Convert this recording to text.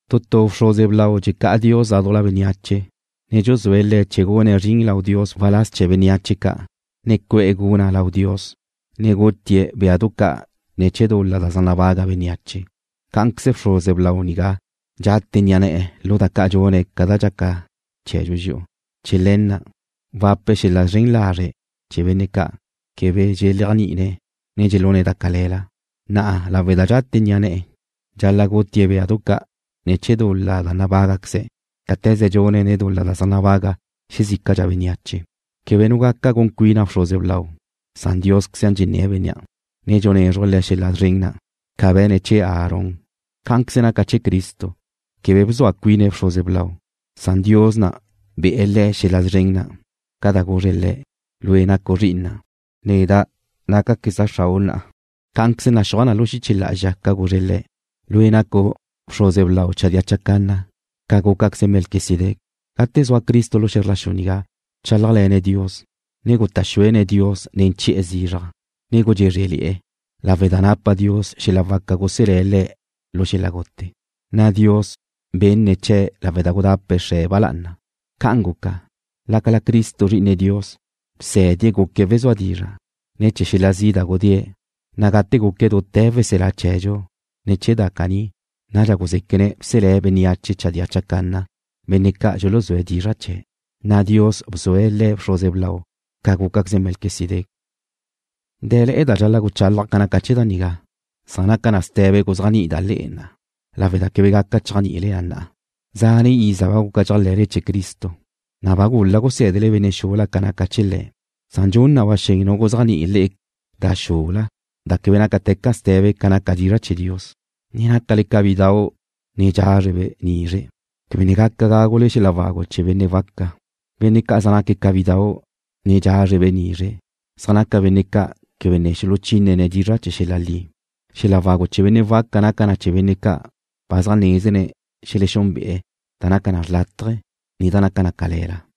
Tu tu bxruze blau dxecá'a Dios ládujla bénneache, ne dxuzúe̱' le̱' chee̱ gune̱' zrin lau Dios waláz chee̱ bénneache ca', ne cu'e̱ guna' lau Dios, ne gutie̱' béadu ca' ne̱ chee̱ dul-la zaj nabaga' bénneache. Cá'anqueze bxruze blau nigá dxate ni'a ne̱'e̱ lu da ca' dxune̱' ca da dxaca chee̱dxu dxi'u. Chee̱ le̱ na' wape̱' xel-la' zren lazre' chee̱ benne' ca' quebe dxeléajni'ine̱', ne dxelune̱' da cale̱la, na' lawe' da dxate ni'a ne̱'e̱, dxal-la' gutie̱' béadu ca' ne̱ chee̱ dul-la da nabágaqueze̱', cáte̱ze dxune̱' ne̱ chee̱ dul-la da zaj nabaga xezícadxa bénneache. Quebe nu gaca gun cuina bxruze blau, san Diósqueze dxenné̱' bénnea', ne dxunézruje̱' le̱' xel-la' szren na', ca be̱ne̱' chee̱ Aarón. Cá'anqueze naca na chee̱ Cristo, quebe bzua cuine̱' bxruze blau, san Dios be̱'e̱ Le̱' xel-la' szren na' ca da guzre̱' Le̱': Lue' nacu' Zri'ina'. Neda' nácaqueza' Xrau' na'a. Cá'anqueze naxúaj na lu xiche lá'azxa ca guzre̱' Le̱': Lue' nacu' bxruze blau chadía chacanna ca gúcaqueze Melquisedec. Gate zua Cristo lu xe̱zr la xu nigá, bchálajle̱ne̱' Dios, ne guta' xuene̱' Dios nen chi'e̱ zizraj, ne gudxézrele̱'e̱, lawe' da napa Dios xel-la' waca guselé̱' Le̱' lu xel-la' gute, na' Dios benne̱' chee̱' lawe' da gudape̱' Xre̱' ba lá'ana. Ca'an guca, lácala naca Cristo Zri'ine Dios, bsé̱die̱' guque̱' wezúa dizra' ne̱ chee̱ xel-la' zi' da gudée̱', na' gate guque̱' dute̱ Weselá chee̱dxu ne̱ chee̱ da caní, nadxa guzéquene̱' bselé̱' bénneache chadía chacanna, benne' ca' dxuluzúe̱' dizra' chee̱', na' Dios bzue̱' Le̱' bxruze blau ca gúcaqueze Melquisedec. Dé̱le̱'e̱ da dxal-la' guchálaja' ca naca chee̱ da nigá, san naca na ste̱be guzéajni'ida' le'e na'a, lawe' da quebe ne gaca chéajni'ile na. Zane' iza ba guca dxéajle̱le chee̱ Cristo, na' ba gul-la' gusé̱dele benne' xula ca naca chee̱ Le̱', san dxun na ba xen nu guzéajni'i le'e da xula da quebe nácate̱ca ste̱be ca naca dizra' chee̱ Dios. Ne nácale ca bidau' ne dxázrebe' nizre'. Quebe ne gaca gágule xel-la' wagu chee̱ benne' waca. Benne' ca' zaj naca ca bidau' ne dxázrebe' nizre' zaj naque̱' benne' ca' quebe ne xuluchínene̱' dizra' chee̱ xel-la' li. Xel-la' wagu chee̱ benne' waca naca na chee̱ benne' ca' ba zaj nézene̱' xelexúnbe'e̱ da naca da xrlátaje, ne da naca da cale̱la.